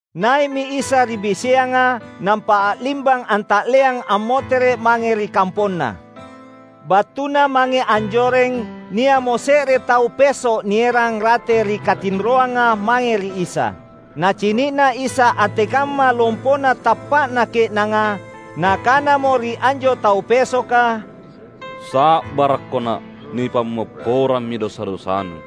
Nai’mi Isa ri biseanga, nampa a’limbang anta’leang ammotere’ mange ri kamponNa. Battuna mange anjoreng, nia’mo se’re tau peso’ nierang rate ri katinroanga mae ri Isa. Nacini’na Isa antekamma lompona tappa’na ke’nanga, Nakanamo ri anjo tau pesoka, "Sa’barakko na’! Nipammopporammi dosa-dosanu."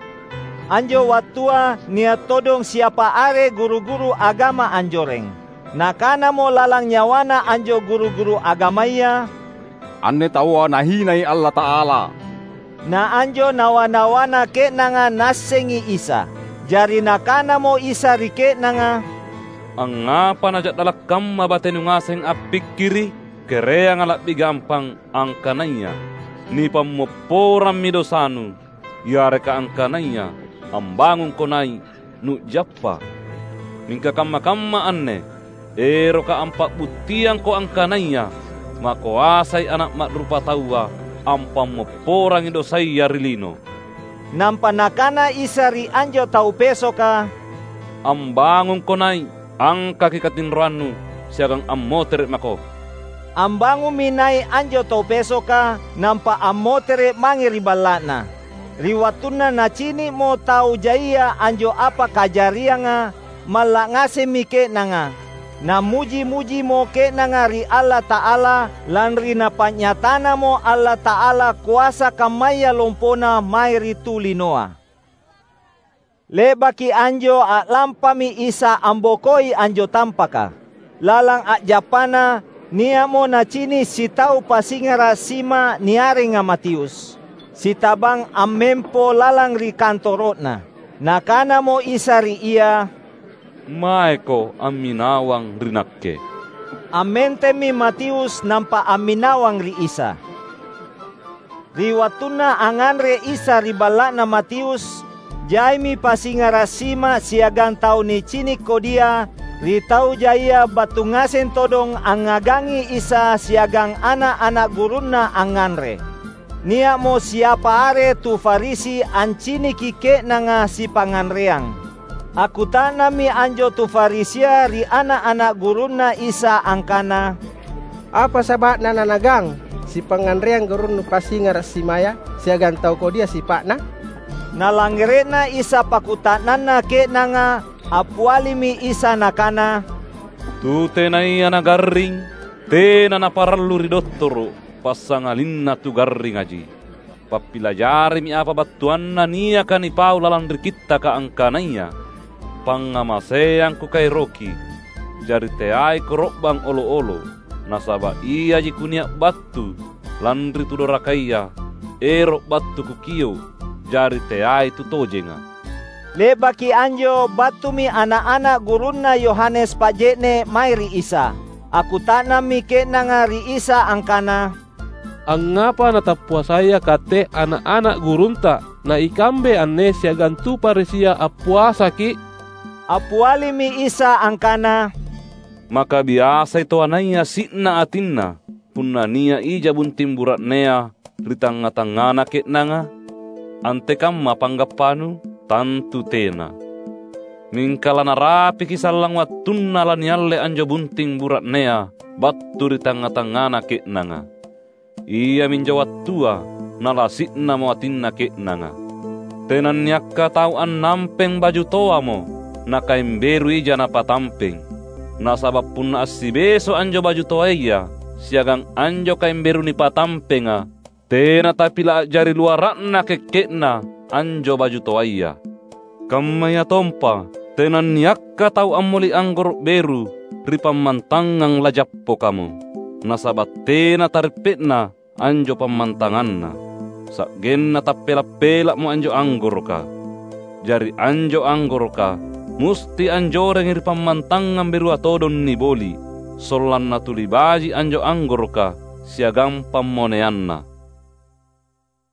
Anjo wattua nia’ todong siapa are guru-guru agama anjoreng. Nakanamo lalang nyawana anjo guru-guru agamaya, "Anne taua nahinai Allata’ala!" Na anjo nawa-nawanna ke’nanga Naassengi Isa. Jari Nakanamo Isa ri ke’nanga, "Angngapa naja’dala’ kamma batenu ngaseng appikkiri’? Kereanga la’bi gampang: angkanaya ‘Nipammopporammi dosanu’, yareka angkanaya ‘Ambangungko nai’ nu’jappa’? Mingka kamma-kamma anne erokKa’ ampa’buttiangko angkanaya makoasai Ana’ Ma’rupataua ampammopporangi dosaya ri lino." Nampa Nakana Isa ri anjo tau pesoka, "Ambangungko nai’, angkaki katinroannu, siagang ammotere’ mako!" Ambangummi nai’ anjo tau pesoka, nampa ammotere’ mange ri balla’na. Ri wattunna nacini’mo tau jaia anjo apa kajarianga, malla’ ngasemmi ke’nanga; nammuji-mujimo ke’nanga ri Allata’ala, lanri Napa’nyatanamo Allata’ala koasa kammaya lompona mae ri tu linoa. Le’baki anjo a’lampami Isa ambokoi anjo tampaka. Lalang a’jappaNa, nia’mo Nacini’ sitau pasingara’ sima niarenga Matius, sitabang ammempo lalang ri kantoro’na. Nakanamo Isa ri ia, "Maeko amminawang ri Nakke!" Ammentemmi Matius nampa amminawang ri Isa. Ri wattunna angnganre Isa ri balla’na Matius, jaimi pasingara’ sima siagang tau nicini’ kodia ri tau jaia battu ngaseng todong angngagangi Isa siagang ana’-ana’ gurunNa angnganre. Nia’mo siapa are tu Farisi anciniki ke’nanga sipangnganreang. Akkuta’nammi anjo tu Farisia ri ana’-ana’ gurunNa Isa angkana, "Apa saba’na naNaagang sipangnganreang gurunnu pasingara’ simaya siagang tau kodia sipa’na?" Nalangngere’na Isa pakkuta’nanna ke’nanga, appialimi Isa Nakana, "Tu tenaya nagarring tena naparallu ri dottoro’, passangalinna tu garringaji. Pappilajarimi apa battuanna niaka nipau lalang ri Kittaka angkanaya: ‘Pangngamaseang Kukaeroki, jari teai koro’bang olo’-olo". Nasaba’ iaji Kunia’ battu lanri tu dorakaya ero’ battu Kukio’, jari teai tu tojenga." Le’baki anjo battumi ana’-ana’ gurunna Yohanes Paje’ne’ mae ri Isa. Akkuta’nammi ke’nanga ri Isa angkana, "Angngapa natappuasaya Katte ana’-ana’ gurunTa, na ikambe anne siagang tu Farisia appuasaki’?" Appialimi Isa angkana, "Maka biasai toanaya si’na atinna punna nia’ ija bunting bura’nea ri tangnga-tangngana ke’nanga? Antekamma panggappanu? Tantu tena! Mingka lanarapiki sallang wattunna lanialle anjo bunting bura’nea battu ri tangnga-tangngana ke’nanga. Iaminjo wattua nalasi’namo atinna ke’nanga. Tenanniakka tau annampeng baju toamo nakaeng beru ija napatampeng. Nasaba’ punna assibeso’ anjo baju toaya siagang anjo kaeng beru nipatampenga, tena tapila’ a’jari luara’na kekke’na anjo baju toaya. Kammayatompa, tenanniakka tau ammoli’ anggoro’ beru ri pammantangang lajappokamo. Nasaba’ tena tareppe’na anjo pammantanganna, sa’genna tappela’-pela’mo anjo anggoroka. Jari anjo anggoroka musti anjorengi ri pammantangang berua todong niboli’, sollanna tuli baji’ anjo anggoroka siagang pammoneanna."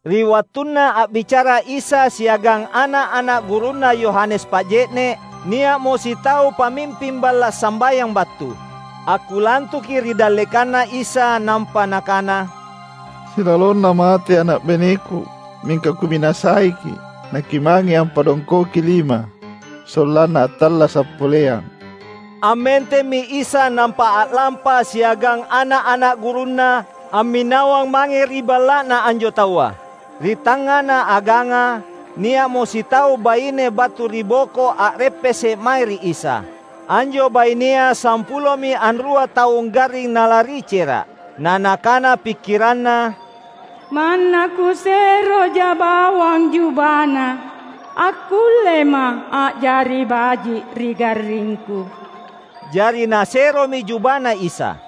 Ri wattunna a’bicara Isa siagang ana’-ana’ gurunna Yohanes Paje’ne’, nia’mo sitau pamimping balla’ sambayang battu. Akkulantuki ri dallekanNa Isa nampa nakana, "Silalonna mate ana’ baineku. Mingka kuminasaiKi’ naKimange ampadongkoki lima, sollanna attallasa’ poleang." Ammentemmi Isa nampa a’lampa siagang ana’-ana’ gurunNa amminawang mange ri balla’na anjo taua. Ri tangngana aganga, nia’mo sitau baine battu ri boko a’reppese’ mae ri Isa. Anjo bainea sampulomi anrua taung garring nalari cera’. Na nakana pikkiranna, "Manna kuseroja bawang jubaNa, akkullema’ a’jari baji’ ri garringku." Jari naseromi jubaNa Isa.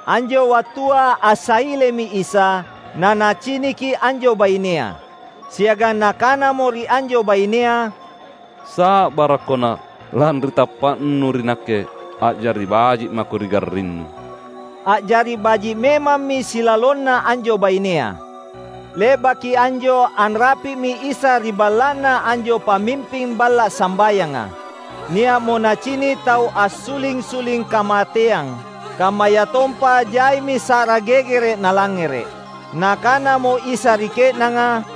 Anjo wattua assailemi Isa, naNaciniki anjo bainea. Siagang Nakanamo ri anjo bainea, "Sa’barakko na’! Lanri tappa’nu ri Nakke, a’jari baji’ mako ri garrinnu!" A’jari baji’ memammi silalonna anjo bainea. Le’baki anjo anrapi’mi Isa ri balla’na anjo pamimping balla’ sambayanga. Nia’mo nacini’ tau assuling-suling kamateyang, kammayatompa jaimi sa’ra gegere’ nalangngere’. Nakanamo Isa ri ke’nanga,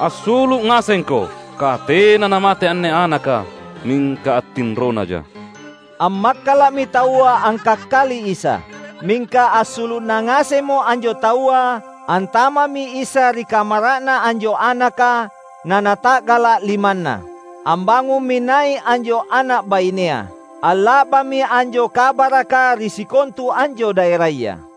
"Assulu’ ngasengko! Katena namate anne anaka, mingka attinronaja." Ammakkala’mi taua angkakkali Isa. Mingka assulu’na ngasemmo anjo taua, antama’mi Isa ri kamara’na anjo anaka, naNata’gala’ limanna. Ambangummi nai’ anjo ana’ bainea. Alla’bammi anjo kabaraka ri sikontu anjo daeraya.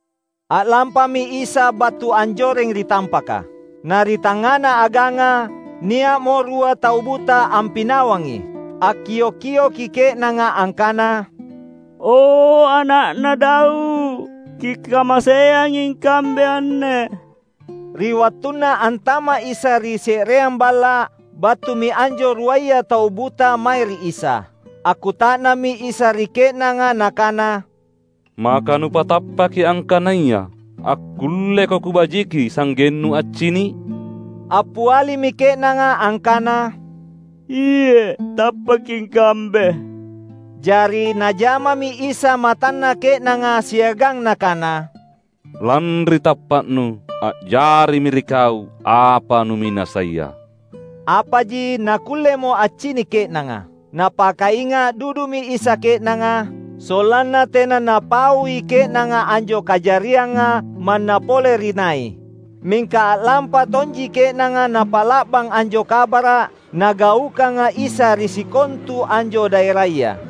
A’lampami Isa battu anjoreng ri tampaka. Na ri tangngana aganga, nia’mo rua tau buta ampinawangi. Akkio’-kioki ke’nanga angkana, "O, Ana’na Daud, Kikamaseangi ikambe anne!" Ri wattunna antama’ Isa ri se’reang balla’, battumi anjo ruaya tau buta mae ri Isa. Akkuta’nammi Isa ri ke’nanga Nakana, "Maka nupatappaki angkanaya akkulleko Kubajiki sa’gennu accini’?" Appialimi ke’nanga angkana, "Iye’ tappaki ikambe!" Jari Najamami Isa matanna ke’nanga siagang Nakana, "Lanri tappa’nu, a’jarimi ri kau apa numinasaia." Apaji nakkullemo accini’ ke’nanga. Napakainga’ dudumi Isa ke’nanga, sollanna tena napaui ke’nanga anjo kajarianga manna pole ri nai. Mingka a’lampa tonji ke’nanga napa’la’bang anjo kabara’ Nagaukanga Isa ri sikontu anjo daeraya.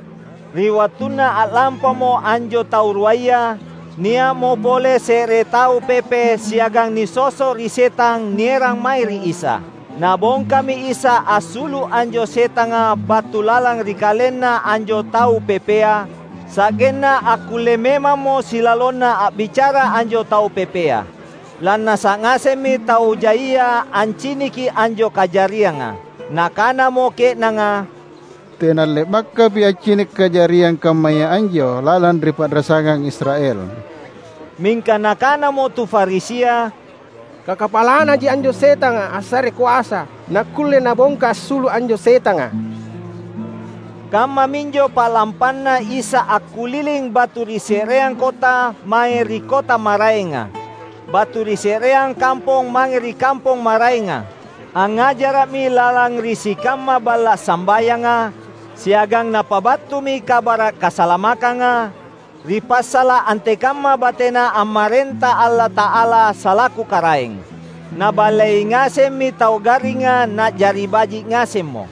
Ri wattunna a’lampamo anjo tau ruaya, nia’mo pole se’re tau pepe siagang nisoso’ ri setang nierang mae ri Isa. Nabongkami Isa assulu’ anjo setanga battu lalang ri kalenna anjo tau pepea; sa’genna akkulle memammo silalonna a’bicara anjo tau pepea. Lannasa’ ngasemmi tau jaia anciniki anjo kajarianga. Nakanamo ke’nanga, "Tena le’bakapaki’ accini’ kajariang kammaya anjo lalang ri pa’rasangang Israel!" Mingka nakanamo tu Farisia, "Kakapalanaji anjo setanga assarei koasa nakkulle Nabongka assulu’ anjo setanga." Kammaminjo pa’lampanna Isa akkuliling battu ri se’reang kota mange ri kota maraenga; battu ri se’reang kampong mange ri kampong maraenga. Angngajara’mi lalang ri sikamma balla’ sambayanga, siagang Napabattumi Kabara’ Kasalamakkanga, ri passala’ antekamma bateNa ammarenta Allata’ala salaku Karaeng. Naballei ngasemmi tau garringa na’jari baji’ ngasemmo.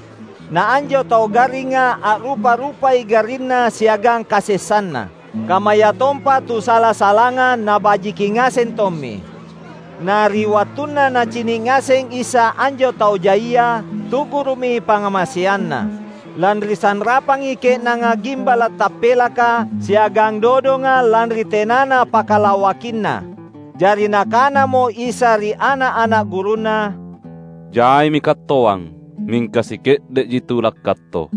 Na anjo tau garringa a’rupa-rupai garrinna siagang kasessanna. Kammayatompa tu sala-salanga nabajiki ngaseng tommi. Na ri wattunna Nacini’ ngaseng Isa anjo tau jaia, tu’guru’mi pangngamaseanNa. Lanri sanrapangi ke’nanga gimbala’ tappelaka siagang dodonga lanri tenana pakalawakinna. Jari Nakanamo Isa ri ana’-ana’ gurunNa, "Jaimi kattoang, mingka sike’de’ji tu lakkatto.